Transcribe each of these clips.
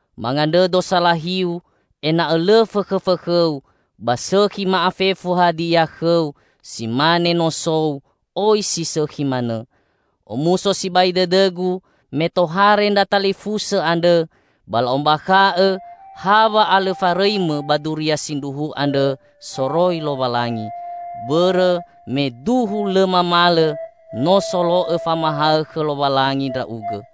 mangandrõdo salahiu ena'õ lõ fõkhõfõkhõu ba sõkhi ma'afefu hadia khõu si mane nosou oi si sõkhi manõ. Omuso sibai dõdõgu me tohare ndra talifusõ andrõ ba la'ombakha'õ ha wa'alõfarõimõ ba duria sindruhu andrõ soroi Lowalangi, bõrõ me duhu lõ mamalõ no solo'õ famahaõ khõ Lowalangi ndra'ugõ.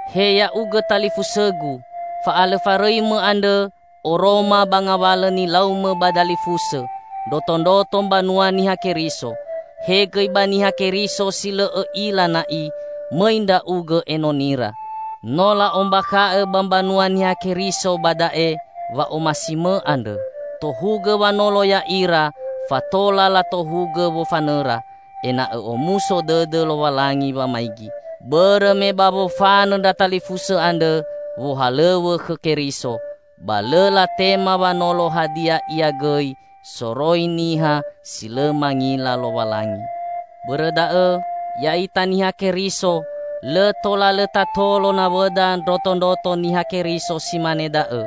He ya'ugõ talifusõgu! Fa'alõfarõimõ andrõ oroma ba ngawalõ nilaumõ ba dalifusõ ndrotondroto mbanua Niha Keriso; he gõi ba Niha Keriso si lõ õ'ila na'i, mõi ndra'ugõ enonira. No la'ombakha'õ ba mbanua Niha Keriso ba da'e wa'omasimõ andrõ. Tohugõ wanolo ya'ira fatola latohugõ wofanõra, ena'õ omuso dõdõ Lowalangi wamaigi. Bõrõ me ba wofanõ ndra talifusõ andrõ wohalõw̃õ khõ Keriso, ba lõ latema wanolo hadia ia gõi soroi niha si lõ mangila Lowalangi. Bõrõ da'õ, ya'ita Niha Keriso lõ tola lõ tatolo nawõda ndrotondroto Niha Keriso si mane da'õ,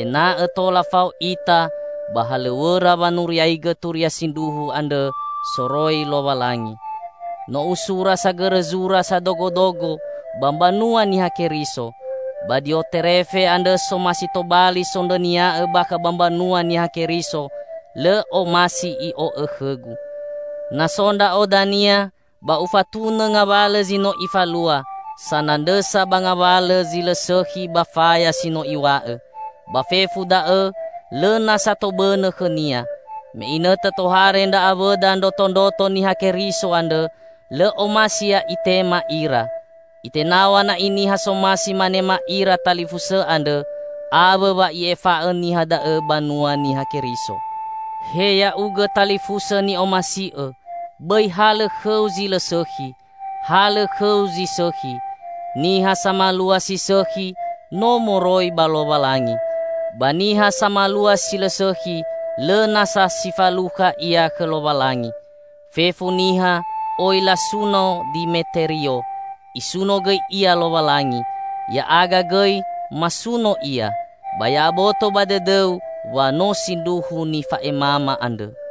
ena'õ tola fao ita ba halõw̃õra wanuriaigõ turia sindruhu andrõ soroi Lowalangi. No usura sagõrõ zura sadogodogo ba mbanua Niha Keriso; ba Dioterefe andrõ somasi tobali sondrõnia'õ bakha ba mbanua Niha Keriso, lõ omasi i'o'õ khõgu. Na so ndra'o dania, ba ufatunõ ngawalõ zi no ifalua, sanandrõsa ba ngawalõ zi lõ sõkhi ba faya si no iw̃a'õ! Ba fefu da'õ lõ nasa tobõnõ khõnia. Me inõtõ tohare ndra awõda ndrotondroto Niha Keriso andrõ, lõ omasi ia itema ira. Itenaw̃a na'i niha somasi manema ira talifusõ andrõ, awõ wa i'efa'õ niha da'õ banua Niha Keriso. He ya'ugõ talifusõ ni'omasi'õ, bõi halõ khõu zi lõ sõkhi. Halõ khõu zi sõkhi. Niha samalua si sõkhi, no moroi ba Lowalangi. Ba niha samalua si lõ sõkhi, lõ nasa si falukha ia khõ Lowalangi. Fefu niha oi lasuno Dimeterio. Isuno gõi ia Lowalangi. Ya'aga gõi masuno ia, ba ya'aboto ba dõdõu wa no sindruhu nifa'emama andrõ.